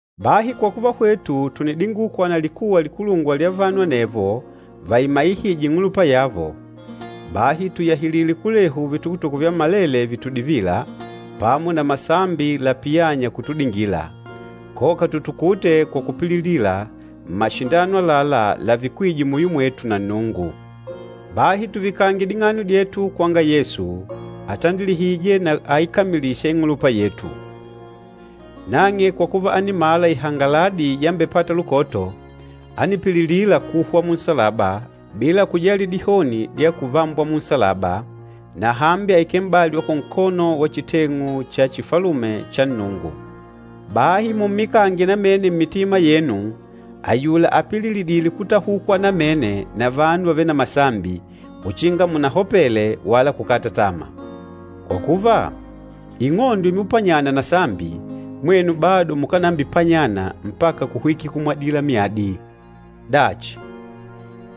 Bahi kwa kuva hwetu tùnidingukwa na likuwa likulungwa lya vanu anevo vaimaihîje ing'ulupa yavo, bahi tùyahilile kulehu vitukutuku vyammalele vitudivîla, pamo na masambi lapiyânya kutudingila, koka tutukute kwa kupililila mmashindano àlalá lavikwîje muyo mwetu na Nnungu. Bahi tuvikange ding'ano dyetu kwanga Yesu, atandilihîje na aikamilîsha ing'ulupa yetu. Nang'e kwa kuva ánimala ihangaladi yambepata lukoto, ánipililila kuhwa munsalaba bila kujali dihoni dya kuvambwa munsalaba, na hambi àikele m'bali wa kunkono wa chiteng'u cha chifalume cha Nnungu. Bahi mummikange namene mmitima yenu ayula apililidîle kutahukwa namene na vanu vavêle na masambi, uchinga munahopele wala kukata tama. Kwa kuva, ing'ondo imupanyana na sambi, mwenu bado mukánambipanyana mpaka kuhwikila kumwadila myadi. Dachi,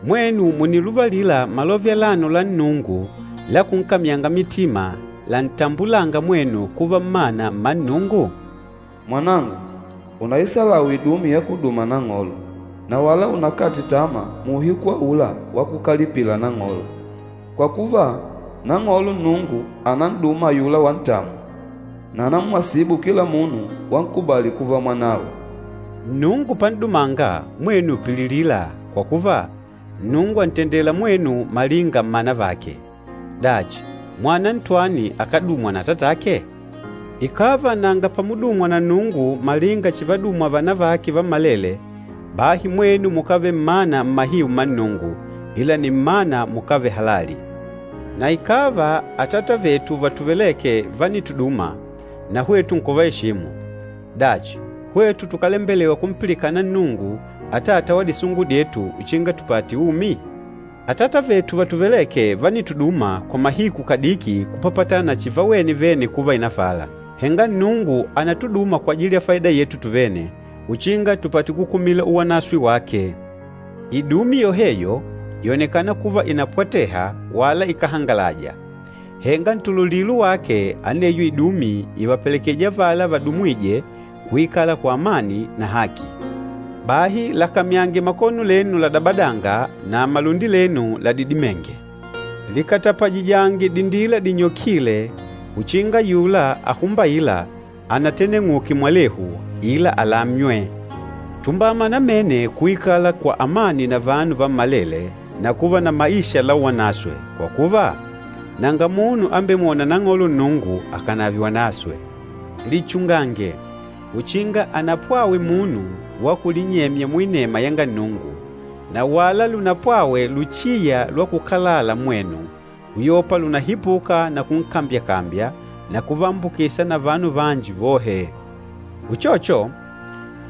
mwenu mùniluvalila malove alano la Nnungu la kunkamyanga mitima lantambulânga mwenu kuva mmana mma Nnungu? “Mwanangu, unaihebule idumi yákudùmà Nang'olo, na wala unakate tama muuhiku aula wakukalipila Nang'olo. Kwa kuva, Nang'olo Nnungu ànan'duma ayula wantamwa, na ànamwasibu kila munu wankubali kuva mwanawe.” Nnungu pan'dumanga, mwenu pililila, kwa kuva, Nnungu àntendela mwenu malinga mmana vake. Dachi, mwana ntwani akádumwa na atatake? Ikàva nanga pamudumwa na Nnungu malinga chivadumwa vana vake vammalele, bahi mwenu mukávele mmana mmahiu mma Nnungu, ila nni mmana mukávele halali. Na ikàva atata vetu vatuvelêke vánituduma, na hwetu nkuvaeshimu, dachi, hwetu tukálembelewa kumpilikana Nnungu, Atata wa disungu dyetu, uchinga tupate umi? Atata vetu vatuvelêke vánituduma kwa mahiku kadiki kupapatana na chivawene vene kuva ìnafala, henga Nnungu ànatuduma kwajili ya faida yetu tuvene, uchinga tupate kukumila uwanaswe wake. Idumi yoheyo, yònekana kuva ìnapwateha wala ikáhangalaja. Henga ntululilo wake aneyo idumi ìvapelekejija avala vadumwîje kuikala kwa amani na haki. Bahi lakamyange makono lenu ladabadanga na malundi lenu ladidimênge. Likatapajijange dindila dinyokîle uchinga ayula ahumbaîla anateneng'uke mwalehu, ila alamywe. Tumbama namene kuikala kwa amani na vanu vammalele na kuva na maisha la uwanaswe, kwa kuva, nanga munu ambemwôna Nang'olo Nnungu akànave wanaswe. Lichungange, uchinga anapwawe munu wa kulinyemya muinema yanga Nnungu, na wala lunapwawe luchiya lwa kukalala mmwenu, uyopa lùnahipuka na kunkambyakambya na kuvaambukisa na vanu vanji vohe. Uchocho,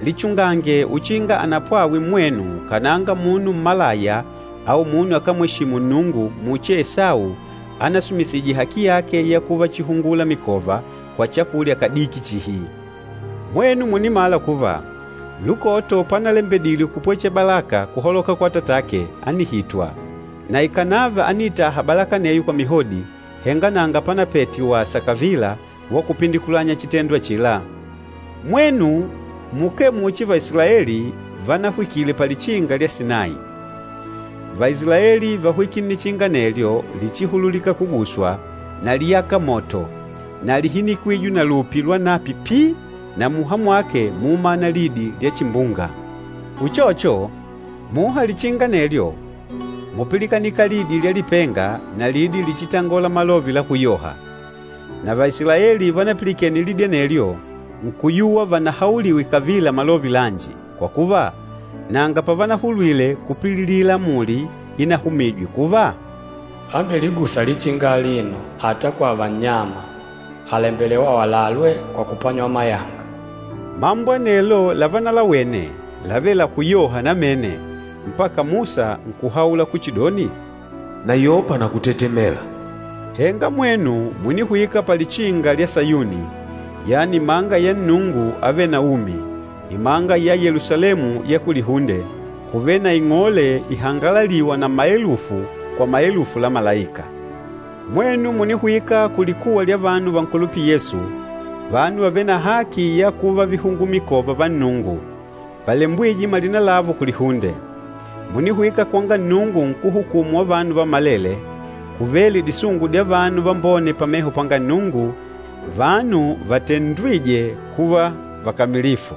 lichungange uchinga anapwawe mmwenu kananga munu mmalaya au munu akámweshimu Nnungu muchi Esau anasumisije haki yake ya kuva chihungula mikova, kwa chakulya kadiki chihi. Mwenu mùnimala kuva, lukoto panalembedile kupwechela balaka kuhaloka kwa atatake, ánihitwa. Na ikànava ániitaha balaka aneyo kwa mihodi, henga nanga pánapete wasa kavila wa kupindikulanya chitendo achila. Mwenu mukee muchi Vaisilaeli vanahwikile palichinga lya Sinayi. Vaisilaeli váhwikile nnichinga anelyo lichihululîka kuguswa, na líyaka moto, na líhinikwije na lupi lwanapi pii na muha mwake múumana lidi lya chimbunga. Uchocho, muha lichinga anelyo múpilikanika lidi lya lipenga na lidi lichitangola malove la kuyoha. Na Vaisilaeli vanapilikene lidi anelyo nkuyuwa vanahauliwe kavila malove lanji, kwa kuva, nanga pavanahulwile kupililila amuli inahumîjwe kuva, “Ambeligûsa lichinga alino, ata kwava nnyama, àlembelewa awalalwe kwa kupanywa mayanga.” Mambo anelo lavanalawene, lávele la kuyoha namene, mpaka Musa nkuhaula kuchidoni, “Nayopa na kutetemela!” Henga mwenu mùnihwika palichinga lya Sayuni, yani imanga ya Nnungu Avêle na Umi, imanga ya Yelusalemu ya kulihunde, kuvêle na ing'ole ihangalalîwa na maelufu kwa maelufu la malaika. Mwenu mùnihwika kulikuwa lya vanu vankulupîla Yesu, vanu vavêle na haki ya kuva vihungula mikova va Nnungu, valembwîje malina lavo kulihunde. Mùnihwika kwanga Nnungu nkúhukumu wa vanu vammalele, kuvêle disungu dya vanu vambone pameho panga Nnungu, vanu vatendwîje kuva vakamilifu.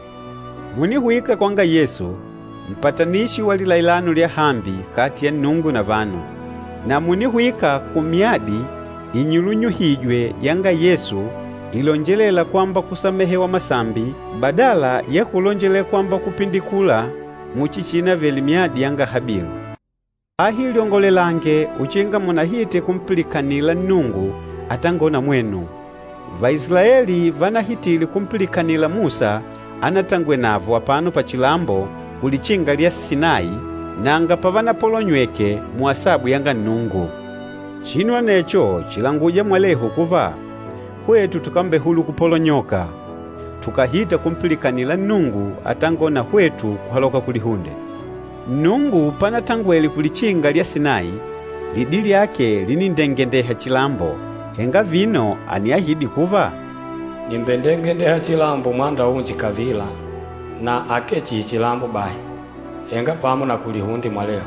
Mùnihwika kwanga Yesu, mpatanishi wa lilailano lyahambi kati ya Nnungu na vanu, na mùnihwika kumyadi inyulunyuhîjwe yanga Yesu ilonjelêla kwamba kusamehewa masambi badala ya kulonjelela kwamba kupindikula muchi chiinavele myadi yanga Habilu. Bahi lyongolelange uchinga munahite kumpilikanila Nnungu atangôla na mwenu. Vaisilaeli vanahitile kumpilikanila Musa anatangwele navo apano pachilambo kulichinga lya Sinayi, nanga pavanapolonyweke muasabu yanga Nnungu. Chinu anecho chìlanguja mwalehu kuva hwetu tukambehulula kupolonyoka, tukàhita kumpilikanila Nnungu atangôla na hwetu kuhaloka kulihunde. Nnungu panatangwele kulichinga lya Sinayi, lidi lyake linindengendeha chilambo, henga vino àniahidi kuva, “Nìmbendengendeha chilambo mwanda unji kavila, na akee chihi chilambo bahi, henga pamo na kulihunde mwalehu.”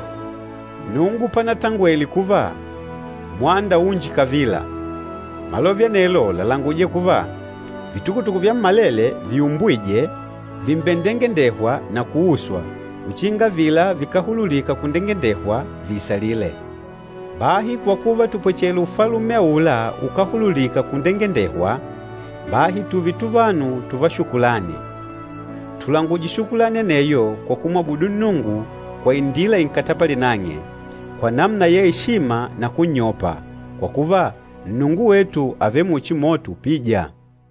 Nnungu panatangwele kuva, “Mwanda unji kavila,” malove anelo làlanguja kuva vitukutuku vyammalele viumbwîje vìmbendengendehwa na kuuswa, uchinga avila vikáhululika kundengendehwa viisalile. Bahi kwa kuva tùpwechela Ufalume aula ukáhululika kundengendehwa, bahi tùùve tuvanu tùvá shukulani. Tulanguje shukulani aneyo kwa kumwabudu Nnungu kwa indila inkatapalîla nang'e, kwa namuna ya eshima na kunnyopa, kwa kuva, Nnungu wetu àvele muchi moto upîja.